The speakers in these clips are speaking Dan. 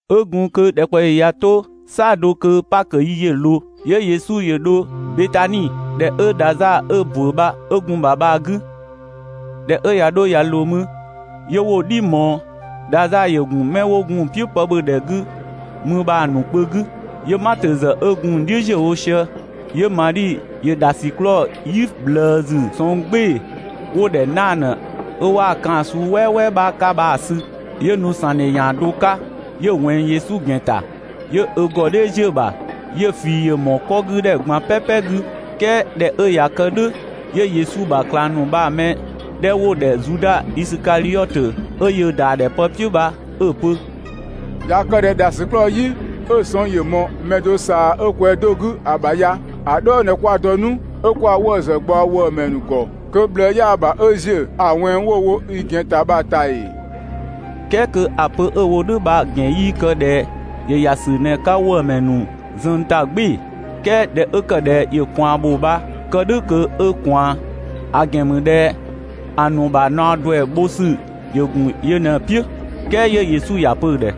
'Ö gun kö ‑dhɛkpaɔyi ꞊ya 'to "saɔdo kö Pakö yi ‑yö ꞊loo, 'yö Yesu ‑yö dho Betani, ‑dhɛ 'ö Dhazaa 'ö‑ ‑bö bha 'ö gun‑ ‑bha bha‑ 'gü. ꞊Dhɛ 'ö ꞊ya 'dho ꞊ya ꞊loo mü, 'yö 'wo‑ "dhi ꞊mɔɔ. Dhazaa ‑yö ‑gun 'mɛ 'wo gun‑ "piʋ̈ pë ‑bhö ‑dhɛ 'gü mü bha‑ ‑nu kpö 'gü, 'yö Matö ‑zë 'ö gun‑ ‑nu "dhiʋ̈ ‑ziö wo sië. 'Yö Madhi ‑yö ‑dhasiklɔɔ "yi ꞊bhlëësü sɔng "gbɩɩ‑ wo‑ ‑dhɛ 'naadhö, 'ö 'waa‑ kaan‑ suu "wɛɛwɛɛ 'bha 'ka bha‑ sü, 'yö nu‑ ‑sangdhe ‑yan do 'ka, 'yö‑ ꞊wɛnng Yesu ‑gɛn ‑ta, 'yö ö ‑gɔ "dhɛ ‑ziö ‑bha. 'Yö‑ ꞊fii ‑yö ꞊mɔɔ 'kɔ 'gü ‑dhɛ ꞊gban "pɛpɛ 'gü. "Kɛɛ ꞊dhɛ 'ö ꞊yaa‑ kë "dhʋ̈, 'yö Yesu ‑bha ꞊klang ‑nu bha‑ mɛ 'dhɛ 'wo‑ ‑dhɛ Zuda Isikadhiɔtö, 'ö yöö ‑da ‑dhɛ pë "piʋ̈ bha 'ö‑ pö: «꞊Ya kë ꞊dhɛ ‑dhasiklɔɔ "yi 'ö‑ sɔng ‑yö ꞊mɔɔ mɛ do ꞊saa 'ö ‑kwɛ do 'gü‑ ‑bha ya‑ "dhɔɔ ꞊në 'kwa‑ dɔ 'nu 'ö 'kwa‑ 'wëë‑ ‑zë ꞊gbaɔ ‑wëëmɛ ‑nu ‑gɔ kö ꞊bhlëë 'yaa‑ ‑bha 'ö ‑ziö ‑a ꞊wɛnng 'wo‑ wo i ‑gɛn ‑ta bha‑ ‑ta ‑ee?» "Kɛɛ kö ‑a pö 'ö‑ wo "dhʋ̈ bha‑ ‑gɛn 'yii kë ꞊dhɛ ‑yö ‑ya ‑sü ꞊në‑ 'ka ‑wëëmɛ ‑nu zuën ‑ta "gbɩɩ‑, "kɛɛ ꞊dhɛ 'ö ‑kë ꞊dhɛ ‑yö ꞊kwaan ‑bho bha kë "dhʋ̈ kö 'ö‑ ꞊kwaan; ‑a ‑gɛn ‑mü ꞊dhɛ ‑a ‑nu ‑bha ‑naɔ ‑duɛ bho ‑sü ‑gun yö ꞊në‑ "piʋ̈. "Kɛɛ 'yö Yesu ‑ya pö‑ ‑dhɛ: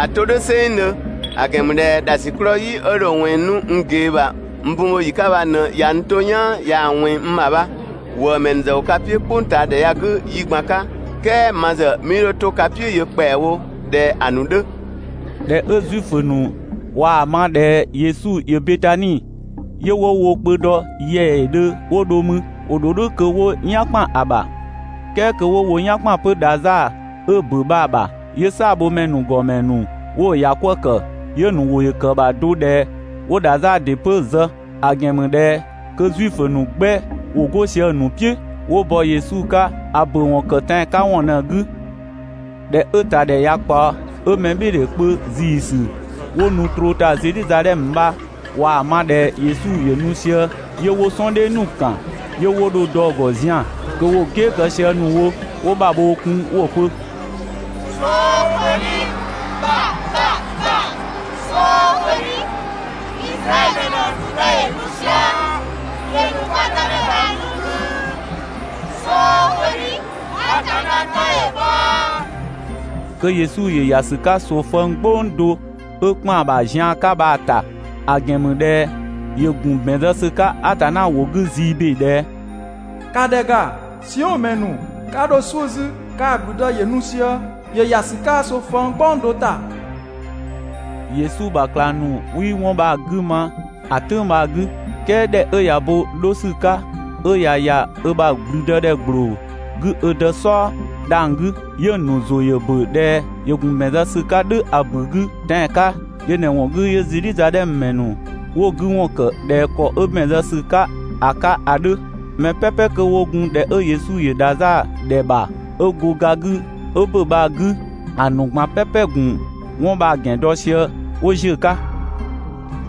«‑A 'to "dhʋ̈ "sɛnngdhö! ‑A ‑gɛn ‑mü ꞊dhɛ ‑dhasiklɔɔ "yi 'ö dho‑ ꞊wɛnng 'nu n ꞊gee ‑bha n bun bho ‑yi 'ka bha ꞊në ꞊ya n 'to "yaan ꞊yaa‑ ꞊wɛnng n ‑bha bha. ‑Wëëmɛ ‑nu ‑zë ‑wo ka "piʋ̈ "kpʋngtaadhɛ ya‑ 'gü yi ꞊gban 'ka, "kɛɛ ma ‑zë 'mii 'dho to ka "piʋ̈ yö ‑kpɛawo ꞊dhɛ ‑a ‑nu 'dhö. ꞊Dhɛ 'ö Zuifö ‑nu ꞊waa‑ ma ꞊dhɛ Yesu ‑yö Betani, 'yö 'wo wo kpö dɔ ‑yɛɛdhö 'wo dho mü. ‑Wo ‑dho "dhʋ̈ kö 'wo "yan ‑kpan ‑bha, "kɛɛ kö 'wo wo "yan ‑kpan 'pö Dhazaa 'ö‑ ‑bö bha‑ ‑bha. 'Yö "saabhomɛ ‑nu ‑gɔmɛ ‑nu 'wo‑ ‑yakwëë ‑kë, 'yö‑ ‑nu ‑wʋ ‑yö ‑kë ‑bha do ꞊dhɛ 'wo Dhazaa ‑dɩ 'pö‑ zë, ‑a ‑gɛn ‑mü ꞊dhɛ kö Zuifö ‑nu 'gbɛ ‑wo 'go sië‑ ‑nu "piʋ̈ 'wo bɔ Yesu 'ka ‑a ‑bö ‑wɔn ‑kë tɛan‑ 'ka ‑wɔn ꞊në‑ 'gü. ꞊Dhɛ 'ö‑ ‑ta ‑dhɛ ꞊ya ꞊kpaɔ, 'ö mɛbhɩɩdhe kpö ‑ziisü 'wo nu troo ‑ta Zedhizadhɛmö bha ꞊waa‑ ma ꞊dhɛ Yesu ‑yö nu sië, 'yö 'wo "sɔɔndhɛ ‑nu ‑kan, 'yö 'wo dho dɔ‑ ‑gɔ zian‑, kö ‑wo "gɛɛ kë sië ‑nu wo 'wo ‑bhabhoo kun 'wo‑ pö: «"Sookwedhi! ‑Bha ‑bha ‑bha! "Sookwedhi! Izraɛdhö ‑mɛ ‑nu ‑bha ‑gblüdë ‑yö nu sië! ‑Yö ‑nu kwa Dëmɛ ‑bha nu 'gü! "Sookwedhi! Atanna 'tɔ‑ bhɔ!» Kö Yesu ‑yö ‑ya ‑sü 'ka ꞊soofëng "gbɔng do 'ö ‑kpan ‑bha zian 'ka bha‑ ‑ta, ‑a ‑gɛn ‑mü ꞊dhɛ ‑yö ‑gun ‑bɛn zë ‑sü 'ka Atanna ‑wʋ 'gü zii ‑be ꞊dhɛ: «‑Ka ‑dhɛ ‑ga, Siɔn ‑mɛ ‑nu, 'ka 'dho "suʋ̈ 'zü, kaa‑ ‑gblüdë ‑yö nu sië, ‑yö ‑ya ‑sü 'ka ꞊soofëng "gbɔng do ‑ta.» Yesu ‑bha ꞊klang ‑nu 'wii 'wɔn bha‑ 'gü ma ‑a "tʋ̈ng bha‑ 'gü, "kɛɛ ꞊dhɛ 'ö ꞊ya bo 'dho ‑sü 'ka 'ö ‑ya ‑ya ö ‑bha ‑blüdëdhɛ ‑gbloo 'gü ö Dë "sɔɔ dhang‑ 'gü, 'yö‑ ‑nu ‑zʋ ‑yö ‑bö ꞊dhɛ ‑yö ‑gun ‑bɛn zë ‑sü 'ka "dhʋ̈ ‑a ‑bu 'gü tɛan‑ 'ka, yö ꞊në‑ ‑wɔn 'gü 'yö Zedhizadhɛmö ‑mɛ ‑nu 'wo‑ 'gü ‑wɔn ‑kë ꞊dhɛ ‑kɔ 'ö ‑bɛn zë ‑sü 'ka‑ 'ka ‑a 'dhö. Mɛ "pɛpɛ 'kö 'wo gun ‑dhɛ 'ö Yesu ‑yö Dhazaa ‑dhɛ ‑bha 'ö go ga 'gü 'ö ‑bö bha‑ 'gü, ‑a ‑nu ꞊gban "pɛpɛ‑ ‑gun 'wɔn bha‑ ‑gɛn dɔ sië 'wo ‑ziö 'ka.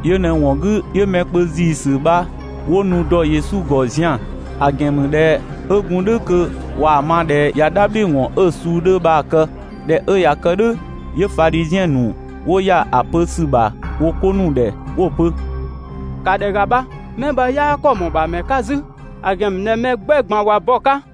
Yö ꞊në‑ ‑wɔn 'gü 'yö mɛ kpö ‑ziisü bha 'wo nu dɔ Yesu ‑gɔ zian‑; ‑a ‑gɛn ‑mü ꞊dhɛ 'ö gun "dhʋ̈ kö ꞊waa‑ ma ꞊dhɛ ꞊ya "dhabhliwɔn 'ö suu 'dhö bha‑ kë. ꞊Dhɛ 'ö ꞊ya kë "dhʋ̈, 'yö Fadhiziɛn ‑nu 'wo ‑ya ‑a pö ‑sü ‑bha wo 'ko ‑nu ‑dhɛ 'wo‑ pö: «‑Ka ‑dhɛ ‑ga bha, 'mɛ bha 'yaa ‑kɔ ‑mɔɔ ‑bha ‑mɛ 'ka 'zü, ‑a ‑gɛn ‑mü ꞊dhɛ mɛ 'gbɛ ꞊gban ꞊wa bɔ‑ 'ka.»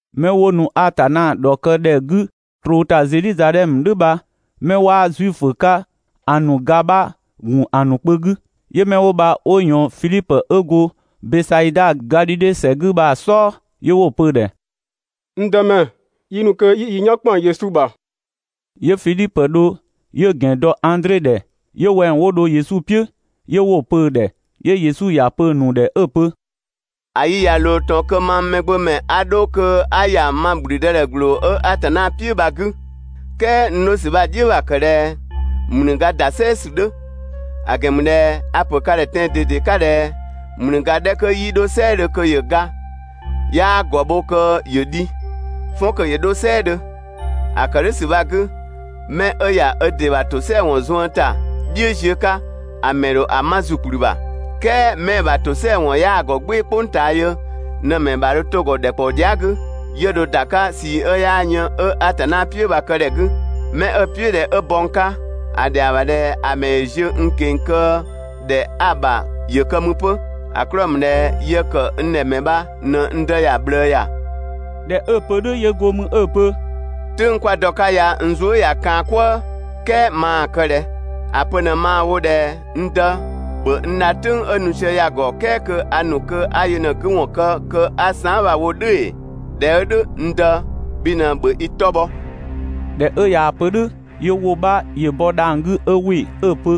'Mɛ 'wo nu Atanna ‑dhɔkë ‑dhɛ 'gü troo ‑ta Zedhizadhɛmö "dhʋ̈ bha 'mɛ 'waa Zuifö 'ka ‑a ‑nu ga bha‑ ‑gun ‑a ‑nu kpö 'gü. 'Yö 'mɛ 'wo bha 'wo ꞊yɔɔn Fidhipö 'ö go Bɛsaida, Gadhidhe ‑sɛ 'gü bha‑ "sɔɔ, 'yö 'wo‑ pö‑ ‑dhɛ: «N Dëmɛ, yi ‑nu kö 'yi yi "yan ‑kpan Yesu ‑bha!» 'Yö Fidhipö ‑yö dho 'yö‑ ‑gɛn dɔ Andre ‑dhɛ, 'yö wɛng 'wo dho Yesu "piʋ̈, 'yö 'wo‑ pö‑ ‑dhɛ. 'yö Yesu ‑ya pö‑ ‑nu ‑dhɛ 'ö‑ pö: «‑A yi ꞊ya ꞊loo ꞊tɔn kö mang Mɛgbömɛ 'a 'dho kö 'a ‑ya ma ‑blüdëdhɛ ‑gbloo 'ö Atanna "piʋ̈ bha‑ 'gü. ("Kɛɛ n 'dho ‑sü bha‑ "dhiʋ̈ ‑bha ‑kë ꞊dhɛ) ‑mlüga ‑da "sɛɛ ‑sü 'dhö, ‑a ‑gɛn ‑mü ꞊dhɛ a‑ ‑pö ka ‑dhɛ tɛan‑ ꞊dede 'ka ꞊dhɛ: «‑Mlüga 'dhɛ 'kö 'yii 'dho "sɛɛdhö kö ‑yö ga, 'yaa ‑gɔ bho kö ‑yö dhi. "Fɔn kö yö 'dho "sɛɛdhö. ‑A ‑kë "dhʋ̈ ‑sü bha‑ 'gü, 'mɛ 'ö ‑ya ö ‑dɩ ‑bha ‑tosɛa ‑wɔn zuën ‑ta "dhiʋ̈ ziö 'ka, ‑a ‑mɛ ‑dho ‑a 'ma ‑zukplü ‑bha. "Kɛɛ 'mɛ‑ ‑bha ‑tosɛa ‑wɔn 'yaa‑ ‑gɔ "gbɩɩ‑ "kpʋng ꞊taa yö ꞊në‑ ‑mɛ ‑bha dho 'to‑ ‑gɔ ‑dhɛkpaɔ dhia" 'gü, 'yö dho ‑da 'ka ꞊sii 'ö 'yaa yën 'ö Atanna "piʋ̈ bha‑ kë ‑dhɛ 'gü. 'Mɛ 'ö‑ "piʋ̈ ꞊dhɛ 'ö bɔ n 'ka, ‑a ‑dhɛa ‑bha ꞊dhɛ ‑a ‑mɛ ‑yö ziö n ꞊keng‑ kö ‑dhɛ 'a‑ ‑bha ‑yö kë mü 'pö, ‑a 'klɔɔ‑ ‑mü ꞊dhɛ yë ‑kë n ‑dhɛ ‑mɛ bha n Dë ‑ya ꞊bhlëë ‑ya. ꞊Dhɛ 'ö‑ pö "dhʋ̈ 'yö 'go mü ö‑ pö: «"Tʋ̈ng 'kwa‑ dɔ‑ 'ka ya n zuë" ꞊ya kaan‑ "kwëë, "kɛɛ maa‑ kë ꞊dhɛ? ‑A pö ꞊në maa‑ wo ꞊dhɛ: N Dë, ‑bhö n dha "tʋ̈ng 'ö nu sië ya‑ ‑gɔ, "kɛɛ kö a ‑nu kö 'a yö ꞊në‑ 'gü ‑wɔn kë kö 'a saan" bha‑ wo "dhʋ̈ ‑ee? ꞊Dhɛ 'ö "dhʋ̈, n Dë, bhi ꞊në ‑bhö i 'tɔ bhɔ!» ꞊Dhɛ 'ö ꞊yaa‑ pö "dhʋ̈, 'yö ‑wʋ 'bha ‑yö bɔ dhang‑ 'gü 'ö ‑wɩ 'ö‑ pö: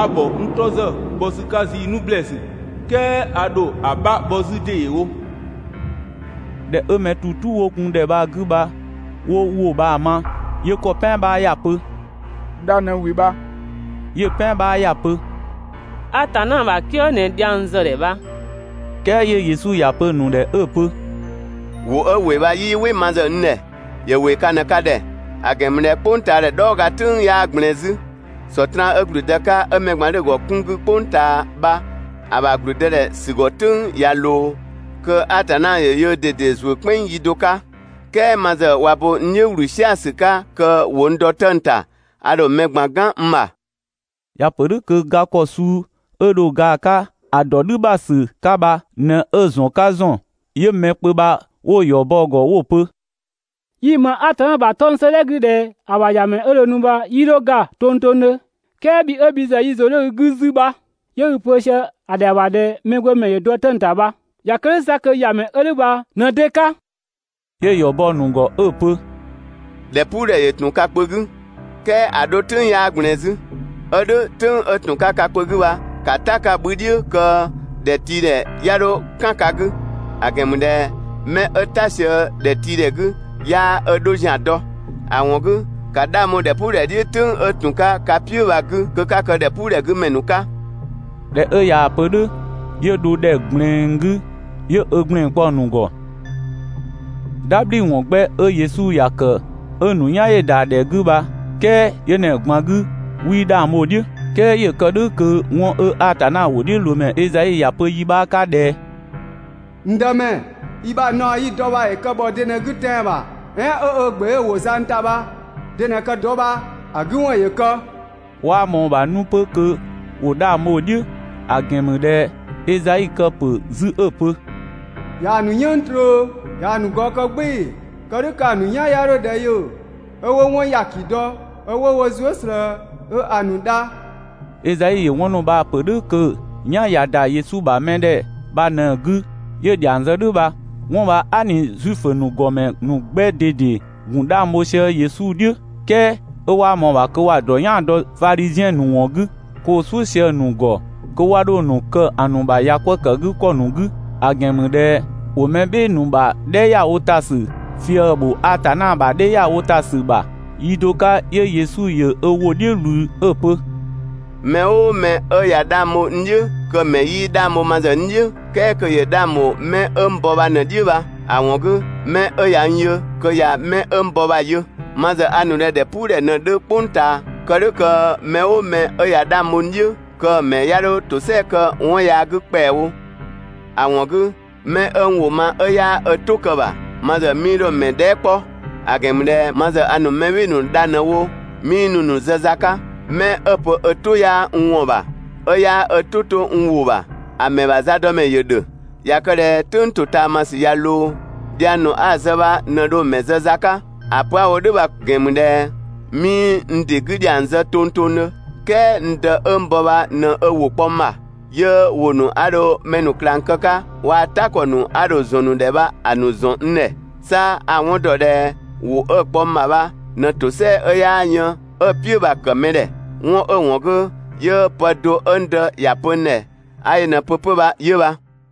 «A ‑bhɔ n 'tɔ ‑zë bhɔ ‑sü 'ka zii 'nu ‑blɛɛsü, "kɛɛ a ‑dho ‑a 'bha bhɔ 'zü ‑deewo.» ꞊Dhɛ 'ö mɛ ‑tu "tu 'wo gun ‑dhɛ bha‑ 'gü bha 'wo ‑wʋ bha‑ ma, 'yö ‑kɔ "pɛan 'bha ‑ya pö: «Dha ꞊në ‑wɩ bha!» 'Yö‑ "pɛan 'bha ‑ya pö: «Atanna ‑bha "kië ꞊në dhiang zë‑ ‑dhɛ bha!» "Kɛɛ 'yö Yesu ‑ya pö‑ ‑nu ‑dhɛ 'ö‑ pö: «‑Wʋ 'ö ‑wɩ bha 'yii "wɩ ma ‑zë n ‑dhɛ, ‑yö ‑wɩ ka ꞊në ka ‑dhɛ. ‑A ‑gɛn ‑mü ꞊dhɛ "kpʋngtaadhɛ "dhɔɔ ga "tʋ̈ng 'yaa ꞊gblɛɛn 'zü, Sɔtraan 'ö ‑gblüdë 'ka ('ö mɛ ꞊gban 'dhö‑ ‑gɔ 'kun 'gü) "kpʋng ꞊taa bha‑ ‑bha ‑gblüdëdhɛ ‑sü ‑gɔ "tʋ̈ng ꞊ya ꞊loo, kö Atanna ‑ya yöö ꞊dede ‑zuö "kpɛnng yi do 'ka. "Kɛɛ ma ‑zë ꞊wa bo n "dhiʋ̈ ‑wlü "sia‑ ‑sü 'ka kö ‑wo n dɔ 'tëng‑ ‑ta, a ‑dho mɛ ꞊gban "gan n ‑bha.» ‑Ya ‑pö "dhʋ̈ kö ga ‑kɔ suu 'ö dho ga‑ 'ka ‑a ‑dɔ "dhʋ̈ ‑bha ‑sü 'ka bha ꞊në 'ö‑ ‑zɔn 'ka ‑zɔn. 'Yö mɛ kpö bha 'wo‑ ‑yɔ bɔ‑ ‑gɔ 'wo‑ pö: «Yi‑ ‑ma Atanna ‑bha 'tɔng‑ 'sëëdhɛ 'gü ꞊dhɛ ‑a ‑bha ‑Yamɛ 'ö dho nu bha 'yii 'dho ga tongtongdhö, "kɛɛ bhi 'ö bhi ‑zë yi ‑zʋ 'dhö i 'gü 'zü bha) 'yö i‑ ‑pö sië ‑a ‑dhɛa ‑bha ꞊dhɛ Mɛgbömɛ ‑yö dɔ 'tëng‑ ‑ta bha. ꞊Ya kë "dhʋ̈ 'sa kö ‑Yamɛ 'ö "dhʋ̈ bha ꞊në de 'ka?» 'Yö‑ ‑yɔ bɔ‑ ‑nu ‑gɔ 'ö‑ pö: «‑Dhɛpuudhɛ ‑yö ‑tun ka kpö 'gü, "kɛɛ ‑a 'dho "tʋ̈ng 'yaa ꞊gblɛɛn 'zü. 'Ö "dhʋ̈, "tʋ̈ng 'ö ‑tun 'ka ka kpö 'gü bha ‑ka "ta‑ 'ka‑ 'bhü "dhiʋ̈ kö ‑dhɛtiidhɛ 'ya 'dho "kan ka 'gü, ‑a ‑gɛn ‑mü ꞊dhɛ 'mɛ 'ö "ta sië ‑dhɛtiidhɛ 'gü 'yaa ö 'dho ‑zian dɔ. ‑A ‑wɔn 'gü, ‑ka 'dhang bho ‑dhɛpuudhɛ "dhiʋ̈ "tʋ̈ng 'ö ‑tun 'ka ka "piʋ̈ bha‑ 'gü kö 'ka kë ‑dhɛpuudhɛ 'gü ‑mɛ ‑nu 'ka.» ꞊Dhɛ 'ö ꞊yaa‑ pö "dhʋ̈, 'yö dho ‑dhɛ ꞊gblɛɛn 'gü 'yö ö ‑gblɛn 'kpɔ‑ ‑nu ‑gɔ. "Dhabhliwɔn 'gbɛ 'ö Yesu ‑ya ‑kë 'ö‑ ‑nu "yan ‑yö ‑da ‑dhɛ 'gü bha, "kɛɛ yö ꞊në‑ ꞊gban 'gü 'wii 'dhang bho‑ "dhiʋ̈. "Kɛɛ ‑yö ‑kë "dhʋ̈ kö 'wɔn 'ö Atanna ‑wʋdhiʋ̈loomɛ Ezai ‑ya pö yi 'bha 'ka ꞊dhɛ: «N Dëmɛ, i ‑bha naɔ 'yi‑ dɔ bha ‑yö kë ‑bhɔ de ꞊në‑ 'gü tɛan‑ ‑bha? "Ɛɛn 'ö ö ‑gbe 'ö‑ ‑wo zang ‑ta bha de ꞊në‑ kë‑ dɔ bha‑ 'gü ‑wɔn ‑yö kë!» 'Waa ꞊mɔɔ‑ ‑bha 'nu 'pö kö ‑wo 'dhang bho‑ "dhiʋ̈, ‑a ‑gɛn ‑mü ꞊dhɛ Ezai kë‑ ‑pö 'zü 'ö‑ pö: ꞊Yaa‑ ‑nu "yënng tröö, ꞊yaa‑ ‑nu gɔɔ kë "gbɩɩ‑, kë "dhʋ̈ kö‑ ‑nu "yan 'ya 'dho ‑dhɛ yö 'ö 'wo 'wɔn ‑nu ‑yaki dɔ 'ö 'wo wo zuë" ꞊slëë 'ö 'a‑ ‑nu dha.» Ezai ‑yö 'wɔn ‑nu bha‑ ‑nu ‑pö "dhʋ̈ kö‑ "yan ꞊ya ‑da Yesu ‑bha mɛdhɛ bha ꞊në‑ 'gü 'yö‑ ‑dhiang zë "dhʋ̈ bha. 'Wɔn bha aa" ꞊ni Zuifö ‑nu ‑gɔmɛ ‑nu 'gbɛ ꞊dede ‑gun 'dhang bho sië Yesu "dhiʋ̈, "kɛɛ 'ö 'waa ‑mɔɔ ‑bha kö ‑wa ‑dɔ "yaan‑ dɔ Fadhiziɛn ‑nu ‑wɔn 'gü, kö ‑wo "suʋ̈ sië‑ ‑nu ‑gɔ kö 'wa 'dho‑ ‑nu kë ‑a ‑nu ‑bha ‑yakwëëkëgükɔ ‑nu 'gü; ‑a ‑gɛn ‑mü ꞊dhɛ ‑wo mɛ "bhɩɩ‑ ‑nu ‑bha "dhɛ ‑ya wo ‑ta ‑sü fië‑ ‑bho Atanna ‑bha "dhɛ ‑ya wo ‑ta ‑sü ‑bha. Yi do 'ka 'yö Yesu ‑yö ö ‑wʋ "dhiʋ̈ ꞊wlü 'ö‑ pö: «'Mɛ "ʋʋ mɛ 'ö ꞊ya 'dhang bho n "dhiʋ̈, kö‑ ‑mɛ 'yii 'dhang bho ma ‑zë n "dhiʋ̈, "kɛɛ kö‑ 'dhang ‑bho 'mɛ 'ö n bɔ bha ꞊në‑ "dhiʋ̈ bha. ‑A ‑wɔn 'gü, 'mɛ 'ö ꞊ya n yö kö ꞊ya mɛ 'ö n bɔ bha‑ yö. Ma ‑zë a ‑nu ꞊dhɛ ‑dhɛpuudhɛ ꞊në 'dhö "kpʋng ꞊taa, kë "dhʋ̈ kö mɛ "ʋʋ mɛ 'ö ꞊ya 'dhang bho n "dhiʋ̈, kö‑ mɛ 'ya 'dho ‑tosɛa kë 'wɔn yaa 'gü ‑kpɛawo. ‑A ‑wɔn 'gü, 'mɛ 'ö n ‑wʋ ma 'ö 'yaa ö "tʋ kë‑ ‑bha, ma ‑zë 'mii 'dho‑ ‑mɛ dhɛɛ" 'kpɔ, ‑a ‑gɛn ‑mü ꞊dhɛ ma ‑zë a ‑nu mɛ "bhɩɩ‑ ‑nu dha ꞊në‑ wo 'mii nu‑ ‑nu zë za 'ka. 'Mɛ 'ö‑ pö ö "tʋ 'yaa n ‑wɔn ‑bha, 'ö 'yaa 'ö "tʋ 'to n ‑wʋ ‑bha, ‑a ‑mɛ ‑bha zadɔmɛ ‑yö ‑dhö. ꞊Ya kë ꞊dhɛ "tʋ̈ng ‑totaamasü ꞊ya ꞊loo, dhiang ‑nu 'a‑ zë bha ꞊në dho‑ ‑mɛ zë za 'ka. ‑A pö 'a‑ wo "dhʋ̈ bha‑ ‑gɛn ‑mü ꞊dhɛ 'mii n ‑dɩ 'gü ‑dhiang zë tongtongdhö, "kɛɛ n Dë 'ö n bɔ bha ꞊në ö ‑wʋ kpɔ n ‑bha, 'yö ‑wʋ ‑nu 'a dho mɛ ‑nu ꞊klang kë‑ 'ka waa‑ "ta ‑kɔ ‑nu 'a dho‑ ‑zɔn ‑nu ‑dhɛ bha‑ ‑nu ‑zɔn n ‑dhɛ. 'Sa a‑ 'wɔn ‑dɔ ꞊dhɛ ‑wʋ 'ö‑ kpɔ n ‑bha bha ꞊në ‑tosɛa 'ö 'yaa yën 'ö‑ "piʋ̈ bha‑ ‑kë mɛ ‑dhɛ. 'Wɔn 'ö‑ ‑wɔn 'gü 'yö pë do 'ö n Dë ‑ya pö n ‑dhɛ 'a yö ꞊në‑ pö 'pö bha 'yö bha.»